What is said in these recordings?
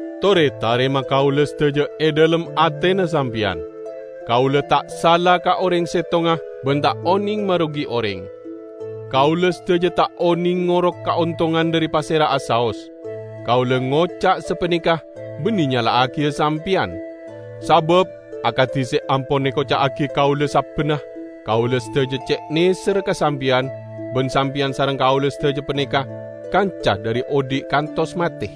Tore tarema kaula sadaja e dhalem atena sampeyan. Kaula ta' sala ka oreng settonga, ban ta' oneng marogi oreng. Kaula sadaja ta' oneng ngoro' kaontongan dhari pasera'a saos. Kaula ngoca' sapaneka banne nyala'agiya sampeyan. Sabab, akadi se ampon ekoca'agi kaula sabbanna, kaula sadaja ce' neserra ka sampeyan, ban sampeyan sareng kaula sadaja paneka kanca dhari odhi' kantos mate.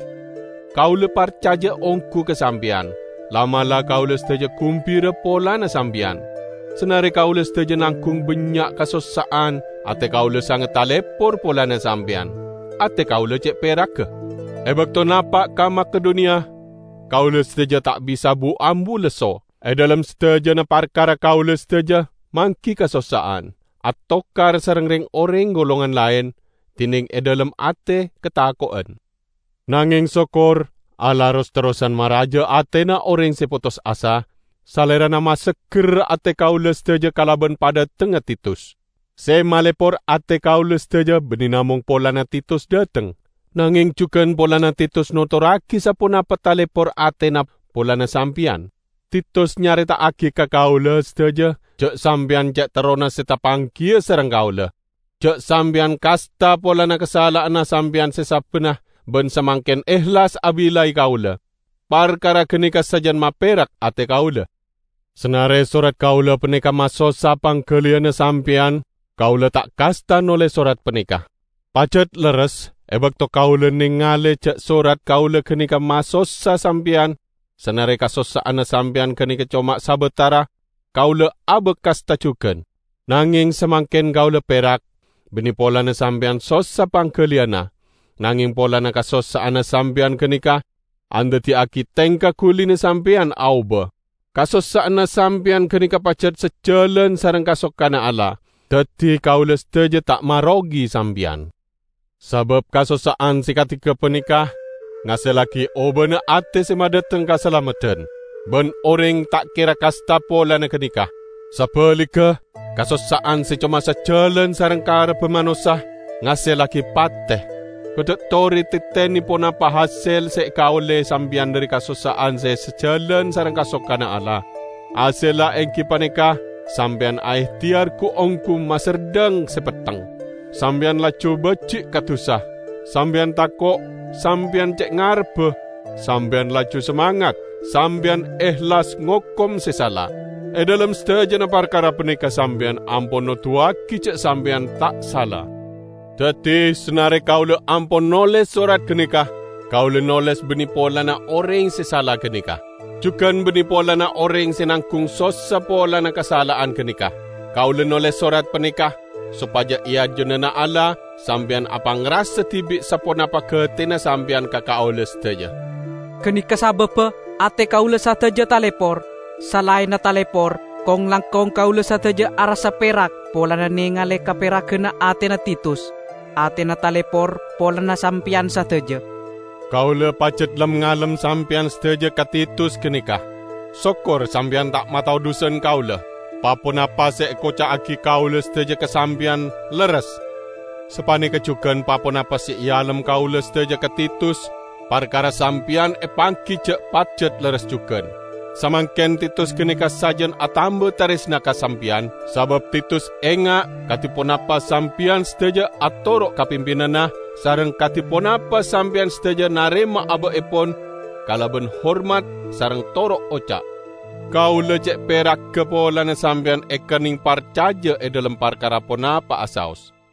Kaula parcaja onggu ka sampeyan. La'-mala' kaula sadaja gumbira polana sampeyan! Sanare kaula sadaja nanggung bannya' kasossa'an, ate kaula sanget talepor polana sampeyan. Ate kaula ce' peragga! E bakto napa' ka Makedoniya, kaula sadaja ta' bisa bu-ambu lesso. E dhalem sadajana parkara kaula sadaja manggi kasossa'an: atokar sareng reng-oreng golongan laen, dineng e dhalem ate katako'en. Nangeng sokkor, Allah ros-terrosan maraja atena oreng se potos asa; Salerana masegger ate kaula sadaja kalaban padhatengnga Titus. Se malepor ate kaula sadaja banne namong polana Titus dhateng, nangeng jugan polana Titus notorragi saponapa talepor atena polana sampeyan. Titus nyareta'agi ka kaula sadaja ja' sampeyan ce' terrona se tapanggiya sareng kaula; ja' sampeyan kasta polana kasala'anna sampeyan se sabbanna ban samangken ehlas abillai kaula. Parkara ganeka sajan maperak ate kaula. Sanare sorat kaula paneka masossa panggaliyanna sampeyan, kaula ta' kasta noles sorat paneka. Pajat lerres e bakto kaula nengale ja' sorat kaula ganeka masossa sampeyan -- sanare kasossa'anna sampeyan ganeka coma sabatara -- kaula abak kasta jugan. Nangeng samangken kaula perak, banne polana sampeyan sossa panggaliyanna, nangeng polana kasossa'anna sampeyan ganeka andaddiyagi tengka gulina sampeyan aoba. Kasossa'anna sampeyan ganeka pajat sajalan sareng kasokanna Allah. Daddi kaula sadaja ta' marogi sampeyan. Sabab kasossa'an se kadi gapaneka ngasellagi obana ate se madhateng kasalameddan. Ban oreng ta' kera kasta polana ganeka. Sabaligga, kasossa'an se coma sajalan sareng karebba manossa ngasellagi pate. Kodda' tore tetene ponapa hasel se ekaolle sampeyan dhari kasossa'an se sajalan sareng kasokanna Allah! Hasella enggi paneka sampeyan aehteyar gu-onggu maserdhang se petteng! Sampeyan laju baji' ka dusa, sampeyan tako', sampeyan ce' ngarebba, sampeyan laju samangat, sampeyan ehlas ngokom se sala. E dhalem sadajana parkara paneka sampeyan ampon noduwagi ja' sampeyan ta' sala. Daddi, sanare kaula ampon noles sorat ganeka, kaula noles banne polana oreng se sala ganeka. Jugan banne polana oreng se nanggung sossa polana kasala'an ganeka. Kaula noles sorat paneka sopaja e ajunanna Allah, sampeyan apangrasa dibi' saponapa gatena sampeyan ka kaula sadaja. Ganeka sababba ate kaula sadaja talepor. Salaenna talepor, kong-langkong kaula sadaja arassa perak polana nengale kaperaganna atena Titus; atena talepor polana sampeyan sadaja. Kaula pajat lem-ngalem sampeyan sadaja ka Titus ganeka. Sokkor sampeyan ta' matodhusan kaula. Pa-ponapa se ekoca'agi kaula sadaja ka sampeyan lerres. Sapaneka jugan pa-ponapa se ealem kaula sadaja ka Titus parkara sampeyan epanggi ja' pajat lerres jugan. Samangken Titus ganeka sajan atamba taresna ka sampeyan, sabab Titus enga' kadi ponapa sampeyan sadaja atoro' ka pimpinanna sareng kadi ponapa sampeyan sadaja narema aba'epon kalaban hormat sareng toro' oca'. Kaula ce' peragga polana sampeyan ekenneng parcaja e dhalem parkara ponapa'a saos.